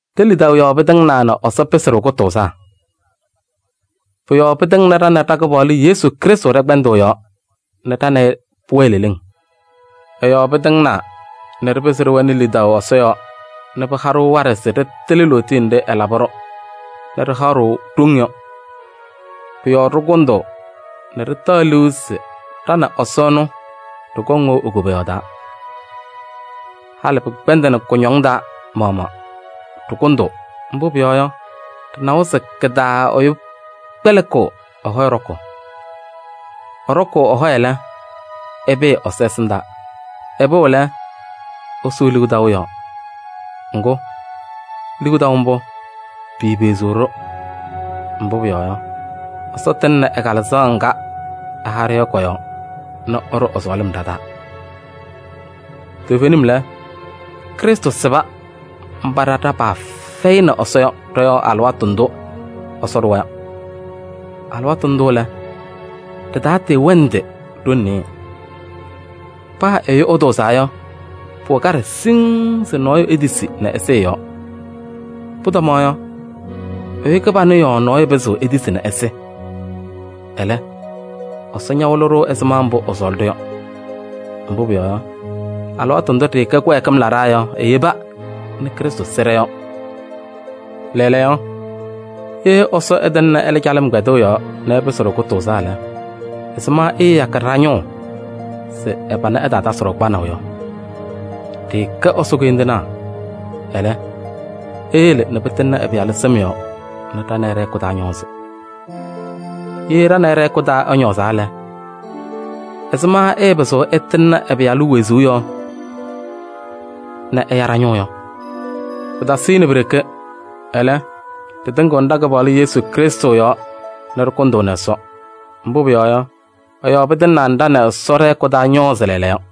Ɖe-lidaʋ yɔɔ pɩtɩŋnaa nɛ Ɛsɔ pɩsɩ-ɖʋ kʋtʋʋzaa. Pʋ-yɔɔ pɩtɩŋnɩ ɖa nɛ ɖa-Kɩpaɣlʋ Yesu Krɩstʋ ɖɛ-kpɛndʋʋ yɔɔ nɛ ɖa nɛ ɩ pʋwɛɛ leleŋ. Ɛ-yɔɔ pɩtɩŋnaa nɛ ɖɩpɩzɩ ɖɩwɛnɩ lidaʋ Ɛsɔ yɔɔ nɛ pɩha-ɖʋ waɖɛ se ɖɩtɩlɩ lootiye nɖɩ ɛlabɩ-ɖʋ nɛ ɖɩhaɣ-ɖʋ ɖoŋ yɔ. Pʋ-yɔɔ ɖɩkʋndʋʋ nɛ ɖɩtaɣ liu se ɖa nɛ Ɛsɔ ɛnʋ ɖɩkɔŋ wɛʋ e-koboyaɣ taa. Halɩ pɩkpɛndɩnɩ kʋñɔŋ taa maɣmaɣ, ɖɩkʋndʋʋ, mbʋ pʋyɔɔ yɔ, ɖɩnawa se kɩ-taa ɛyʋ kpɛlɩkɩɣ ɛ-hɔyɛ ɖɔkʋʋ. Ɛɖɔkʋʋ ɛ-hɔyɛ lɛ, ɛpɩɩ Ɛsɔ ɛsɩndaa. Ɛpɩɣ lɛ, ɛsʋʋ liu taʋ yɔɔ. Ŋgʋ, liu taʋ mbʋ, piipeɣziɣ-ɖʋ. Mbʋ pʋyɔɔ yɔ, Ɛsɔ tɩŋnɩ ɛ-Kalɩzaɣ ŋga ɛha-ɖʋ yɔ kɔ-yɔɔ nɛ ɛɖʋ ɛ-sɔɔlɩm ɖa-taa. Toovenim lɛ, Krɩstʋ sɩba mba ɖa ɖa-paa fɛyɩnɩ Ɛsɔ yɔ ɖɔ-yɔɔ alɩwaatʋ ndʋ Ɛsɔ ɖʋwa yɔ. Alɩwaatʋ ndʋ lɛ, ɖɩtatɩɩwɛnɩdɩ ɖoŋ nɩɩyɩ. Paa ɛyʋ ɛtʋʋzaa yɔ, pʋwɛ kaɖɛ siŋŋ se nɔɔyʋ etisi nɛ ɛsɩ ɛ-yɔɔ. Pʋtɔmaɣ yɔ, ɛyʋ kɩbanʋ yɔɔ nɔɔyʋ pɩzɩɣ etisi nɛ ɛsɩ. Ɛlɛ, Ɛsɔ ñawɩlɩ-ɖʋ ɛzɩma mbʋ ɛsɔɔlɩ-ɖʋ yɔ. Mbʋ pʋyɔɔ yɔ, alɩwaatʋ ndʋ ɖɩɩkɛ kɩwɛɛkɩm laɖaa yɔ eyeba nɛ Krɩstʋ sɩ ɖɔ-yɔɔ. Lɛɛlɛɛyɔ, ye Ɛsɔ ɛtɩŋnɩ ɛlɛ calɩm kpɛndʋʋ yɔɔ nɛ ɛpɩsɩ-ɖʋ kʋtʋʋzaa lɛ, ɛzɩma ɛɛyakɩ ɖa-ñʋʋ se ɛ-pana ɛtaatasɩ-ɖʋ kpanaʋ yɔ? Ɖɩɩkɛ Ɛsɔ koyindinaa. Ɛlɛ, eyele nɛ pɩtɩŋnɩ ɛ-Pɩyalʋ sɩm yɔɔ nɛ ɖa nɛ ɩ ɖɛ-hɛkʋ taa ñɔɔzɩ. Ye ɖa nɛ ɩ ɖɛ-hɛkʋ taa ɛñɔɔzaa lɛ, ɛzɩma ɛɛpɩzɩɣ ɛtɩŋnɩ ɛ-Pɩyalʋ wezuu yɔɔ nɛ ɛya ɖa-ñʋʋ yɔ? Pɩtasɩnɩ pi-ɖeke, ɛlɛ, ɖɩtɩŋɩɣnɩ ɖa-Kɩpaɣlʋ Yesu Krɩstʋ yɔɔ nɛ ɖɩkʋndʋʋnɩ Ɛsɔ. Mbʋ pʋyɔɔ yɔ, ɛ-yɔɔ pɩtɩŋnaa nɛ ɖa nɛ Ɛsɔ ɖɛ-hɛkʋ taa ñɔɔzɩ lɛɛlɛɛyɔ.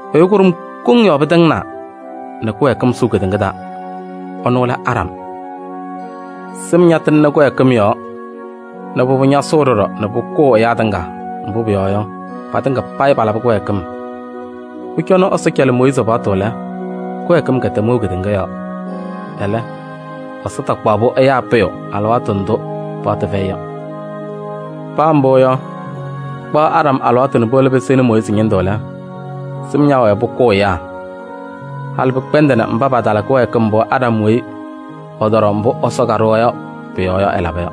Ɛyʋ kʋɖʋm koŋ yɔɔ pɩtɩŋnaa nɛ kɩwɛɛkɩm sʋʋ kedeŋa taa: ɛnʋ lɛ Aɖam. Sɩm ñatɩŋnɩ kɩwɛɛkɩm yɔɔ nɛ pʋbʋ ñasʋʋ ɖɔɖɔ nɛ pʋkʋʋ ɛyaa tɩŋa, mbʋ pʋyɔɔ yɔ, patɩŋa payɩ palabɩ kɩwɛɛkɩm. Pʋcɔ nɛ Ɛsɔ cɛlɩ Mooyiizi paɣtʋ lɛ, kɩwɛɛkɩm kɛtɛm wɛʋ kedeŋa yɔɔ. Ɛlɛ, Ɛsɔ takpaɣ-pʋ ɛyaa pʋyʋ alɩwaatʋ ndʋ paɣtʋ fɛyɩ yɔ. Paa mbʋ yɔ, kpaɣ Aɖam alɩwaatʋ nɛ puwolo pɩsɩnɩ Mooyiizi ñɩndʋ lɛ, sɩm ñaawɛɛ pʋkʋʋ ɛyaa. Halɩ pɩkpɛndɩnɩ mba patala kɩwɛɛkɩm mbʋ Aɖam weyi ɛtɔɖɔ mbʋ Ɛsɔ kaɖʋwa yɔ pʋ-yɔɔ yɔ, ɛlaba yɔ.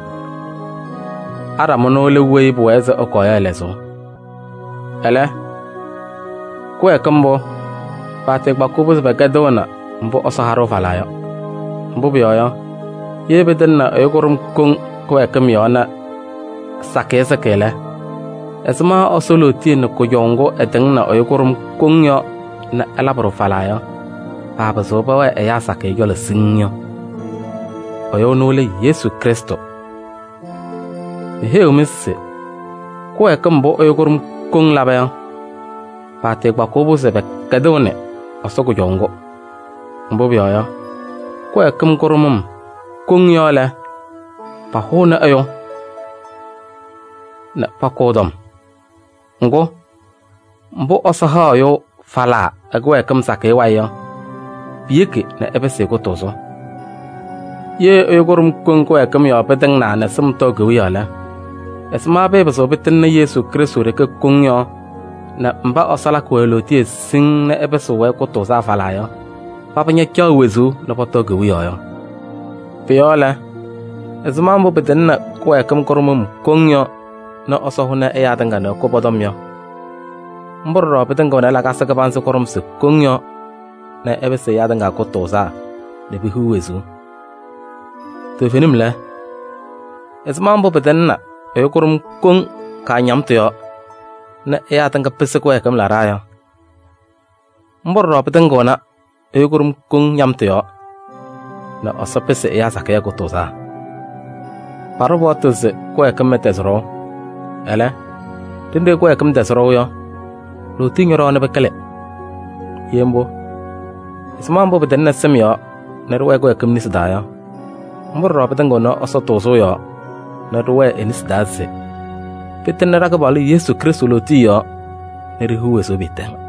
Aɖam ɛnʋ lɛ weyi pʋwɛɛ se ɛkɔɔ yɔ ɛ-lɛzʋʋ. Ɛlɛ, kɩwɛɛkɩm mbʋ, paatɩɩkpakɩɣ-pʋ se pɛkɛdɩɣnɩ mbʋ Ɛsɔ ha-ɖʋ falaa yɔ. Mbʋ pʋyɔɔ yɔ, ye pɩtɩŋnɩ ɛyʋ kʋɖʋm koŋ kɩwɛɛkɩm yɔɔ nɛ sakɩyɛ sɩkɩ lɛ, ɛzɩma Ɛsɔ lootiye nɛ kʋjɔʋ ŋgʋ ɛtɩŋnɩ ɛyʋ kʋɖʋm koŋ yɔɔ nɛ ɛlabɩ-ɖʋ falaa yɔ, paapɩzɩɣ pɛwɛɛ ɛyaa sakɩyɛ cɔlɔ siŋŋ yɔ? Ɛyʋ ɛnʋ lɛ Yesu Krɩstʋ. Meheyiɣ-mɩ se kɩwɛɛkɩm mbʋ ɛyʋ kʋɖʋm koŋ laba yɔ, paatɩɩkpakɩɣ-pʋ se pɛkɛdɩɣnɩ Ɛsɔ kʋjɔʋ ŋgʋ. Mbʋ pʋyɔɔ yɔ, kɩwɛɛkɩm kʋɖʋmʋm koŋ yɔɔ lɛ, pahʋʋnɩ ɛyʋ nɛ pakʋ ɛ-tɔm. Ŋgʋ, mbʋ Ɛsɔ haɣ ɛyʋ falaa ɛ-kɩwɛɛkɩm sakɩyɛ wayɩ yɔ, piyeki nɛ ɛpɩsɩ-ɩ kʋtʋʋzʋ. Ye ɛyʋ kʋɖʋm koŋ kɩwɛɛkɩm yɔɔ pɩtɩŋnaa nɛ sɩm tɔɔ kewiyaɣ lɛ, ɛzɩma pɩɩpɩzɩɣ pɩtɩŋnɩ Yesu Krɩstʋ ɖeke koŋ yɔɔ nɛ mba Ɛsɔ lakɩ-wɛ lootiye siŋŋ nɛ ɛpɩsɩɣ-wɛ kʋtʋʋzaa falaa yɔ, paba ñacaɣ wezuu nɛ pɔtɔɔ kewiyaɣ yɔ? Pʋ-yɔɔ lɛ, ɛzɩma mbʋ pɩtɩŋnɩ kɩwɛɛkɩm kʋɖʋmʋm koŋ yɔɔ nɛ Ɛsɔ hʋnɩ ɛyaa tɩŋa nɛ ɛkʋ pɔ-tɔm yɔ, mbʋ ɖɔɖɔ pɩtɩŋɩɣnɩ lakasɩ kɩbanzɩ kʋɖʋmsɩ koŋ yɔɔ nɛ ɛpɩsɩ ɛyaa tɩŋa payɩ kʋtʋʋzaa nɛ pehiɣ wezuu. Toovenim lɛ, ɛzɩma mbʋ pɩtɩŋnɩ ɛyʋ kʋɖʋm koŋ kaañamtʋ yɔɔ nɛ ɛyaa sakɩyɛ pɩsɩ kɩwɛɛkɩm laɖaa yɔ, mbʋ ɖɔɖɔ pɩtɩŋɩɣnɩ ɛyʋ kʋɖʋm koŋ ñamtʋ yɔɔ nɛ Ɛsɔ pɩsɩ ɛyaa sakɩyɛ kʋtʋʋzaa. Paɖʋ paɣtʋ se kɩwɛɛkɩm ɛtɛzɩ ɖɔʋ. Ɛlɛ, ɖenɖe kɩwɛɛkɩm tɛzɩ ɖɔʋ yɔ, lootiye ñɔɖɔwa nɛ pɩkɩlɩ. Ye mbʋ, ɛzɩma mbʋ pɩtɩŋnɩ sɩm yɔɔ nɛ ɖɩwɛɛ kɩwɛɛkɩm nesi taa yɔ, mbʋ ɖɔɖɔ pɩtɩŋɩɣnɩ Ɛsɔ tʋʋzʋʋ yɔɔ nɛ ɖɩwɛɛ e-nesi taa se pɩtɩŋnɩ ɖa-Kɩpaɣlʋ Yesu Krɩstʋ lootiye yɔɔ nɛ ɖihiɣ wezuu pɩɩtɛŋ.